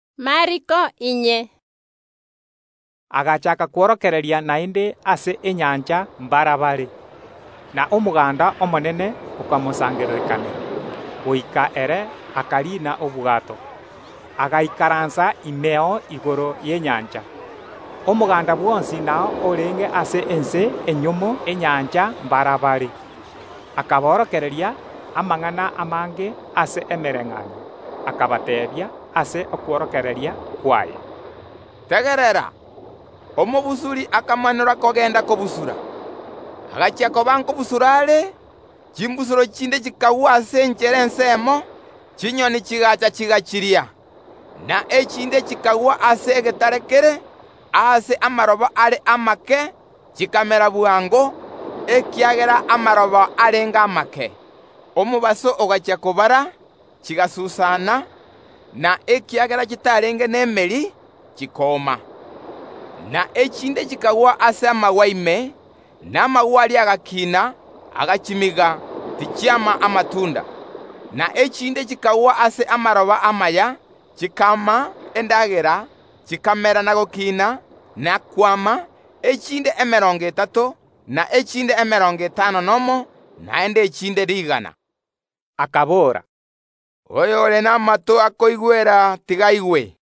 Erio Yeso agachaaka kworokereria naende ase enyancha mbarabare, na omoganda omonene okamosangererekanera, goika ere akariina obwato, agaikaransa imeo igoro y’enyancha. Omoganda bwonsi nao orenge ase ense enyomo enyancha mbarabare. Akaborokereria amang’ana amange ase emebayeeno, akabateebia ase okworokereria kwaye, “Tegerera! Omobusuri akamanora kogenda kobusura. Agachia koba nkobusura are, chimbusuro chinde chikagwa ase enchera ensemo, chinyoni chigaacha chigachiria. Na echinde chikagwa aase egetare kere, aase amaroba are amake; chikamera bwango, ekiagera amaroba arenge amake. Omobaso ogachia kobara, chigasusana, na ekiagera chitarenge nemeri, chikooma. Na echinde chikagwa ase amagwa ime, na amagwa aria agakiina, agachimiga, tichiama amatunda. Na echinde chikagwa ase amaroba amaya, chikaama endagera, chikamera na gokina, na kwama; echinde emerongo etato, na echinde emerongo etano nomo, naende echinde rigana.” Akabora, “Oyore namato akoigwera tiga aigwe.”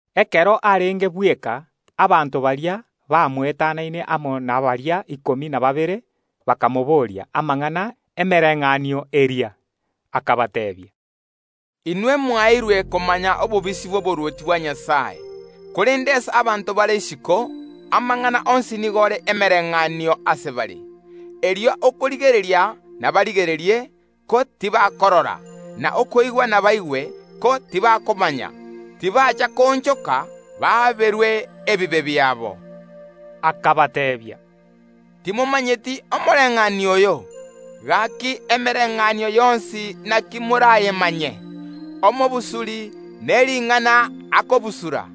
Ekero arenge bweka, abanto baria bamoetanaine amo nabaria ikomi na babere bakamobooria amang’ana y’emebayeeno eria. Yeso akabateebia, “Inwe mwaeirwe komanya obobisi bw’oborwoti bwa Nyasae, korende ase abanto bare isiko, amang’ana onsi nigo are emebayeeno ase bare, erio okorigereria nabarigererie, ko tibakorora, na okoigwa nabaigwe, ko tibakomanya; tibacha koonchoka, baaberwe ebibe biabo.” Erio Yeso akabateebia, “Timomanyeti omobayeeno oyo? Gaki emebayeeno yonsi naki morayemanye? Omobusuri nering’ana akobusura.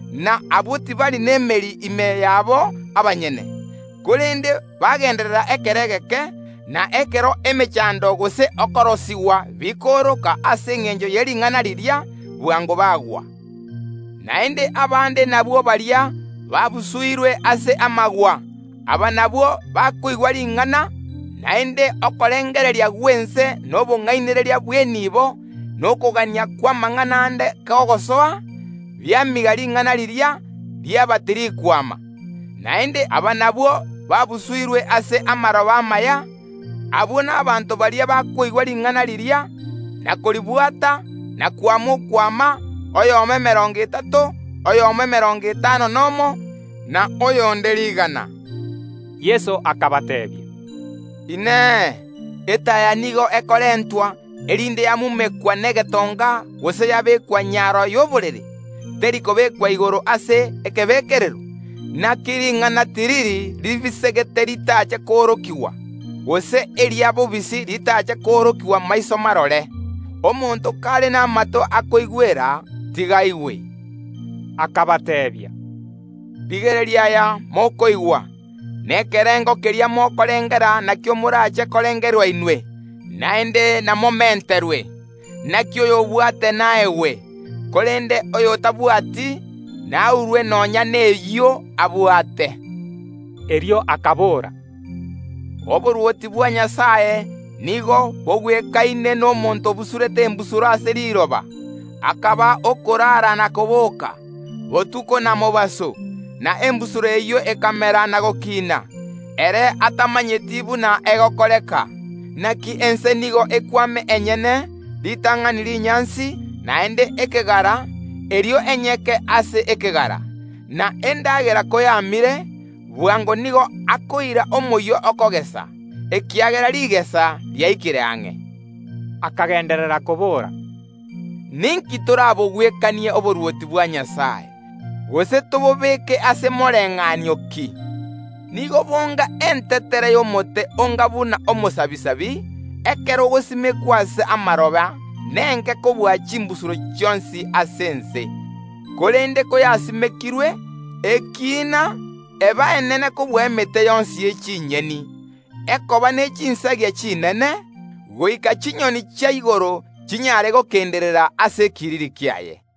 na abwo tibari nemeri ime yabo abanyene, korende bagenderera ekero egeke, na ekero emechando gose okorosigwa bikooroka ase engencho ye ring’ana riria, bwango bagwa. Naende abande nabwo baria babusuirwe ase amagwa, aba nabwo bakoigwa ring’ana, naende okorengereria gw’ense na obong’ainereria bw’eniibo, na okogania kw’amang’ana ande kogosoa, biamiga ring’ana riria, riaba tirikwama. Naende aba nabwo babusuirwe ase amaroba amaya, abwo n’abanto baria bakoigwa ring’ana riria, na koribwata, na kwama okwama, oyomo emerongo etato, oyomo emerongo etano nomo, na oyonde rigana.” Yeso akabateebia, “Inee! Etaya nigo ekorentwa erinde yamumekwa negetonga gose yabekwa nyaro y’oborere? Teri kobekwa igoro ase ekebekerero? Inaki ring’ana tiriri ria bobisi ritache koorokigwa, gose eribisegete ritache koorokigwa maiso marore. Onye omonto ore n’amato akoigwera, tiga aigwe.” Akabateebia, “Rigereria aya mokoigwa; na ekerengo keria mokorengera nakio morache korengerwa inwe, naende namomenterwe. Inaki oyobwate naegwe; korende oyotabwati naurwe nonya nekio abwate.” Erio Yeso akabora, “Oborwoti bwa Nyasae nigo bogwekaine nomonto obusurete embusuro ase riroba. Akaba okoraara botuko na koboka, mobaso, na embusuro eyio ekamera na gokiina, ere atamanyeti buna egokoreka. Inaki ense nigo ekwama enyene, ritang’ani rinyansi, naende ekegara, erio enyeke ase ekegara. Na endagera koyamire, omonto oyio bwango nigo akoira omoyio bwokogesa, ekiagera rigesa riaikire ang’e.” Erio Yeso akagenderera koboora, “Ninki torabogwekanie oborwoti bwa Nyasae? Gose tobobeke ase mobayeeno ki? Nigo bonga entetere y’omoaruni, ekero egosimekwa ase amaroba nenke kobua chimbusuro chionsi ase ense, korende koyasimekirwe, yakiina, yaba enene kobua emete yonsi y’amato, yaba ne chinsagia chinene; goika chinyoni chia igoro chinyare gokenderera ase ekiriri kiaye.”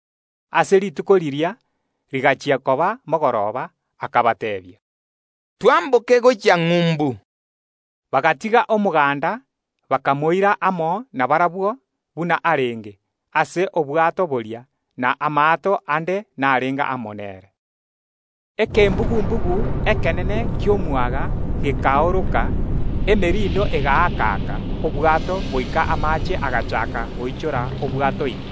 Ase rituko riria, rigachia koba mogoroba, akabateebia, “Twamboke gochia ng’umbu.” Bagatiga omoganda, bakamoira amo nabarabwo, buna arenge, ase obwato boria. Na amaato ande narenge amo nere Ekembugu‐mbugu ekenene ki’omwaga gekaoroka, emerindo egaaka‐aka obwato goika amaache agachaaka goichora obwato ime.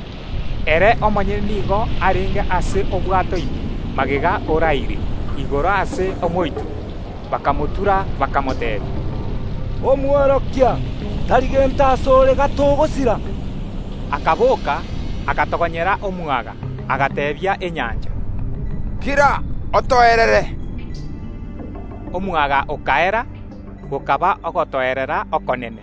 Ere omonyene nigo arenge ase obwato ime magega oraire igoro ase omoito. Bakamotura, bakamoteebia, “Omworokia, tari gento ase ore gatogosira?” Yeso akaboka, agatogonyera omwaga, agateebia enyancha, “Kira, otoerere!” Omwaga okaera; gokaba ogotoerera okonene.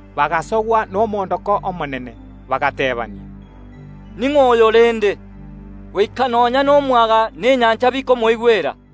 Bagasogwa nomoondoko omonene, bagateebania, “Oyo ning’o rende, goika nonya nomwaga na enyancha bikomoigwera?”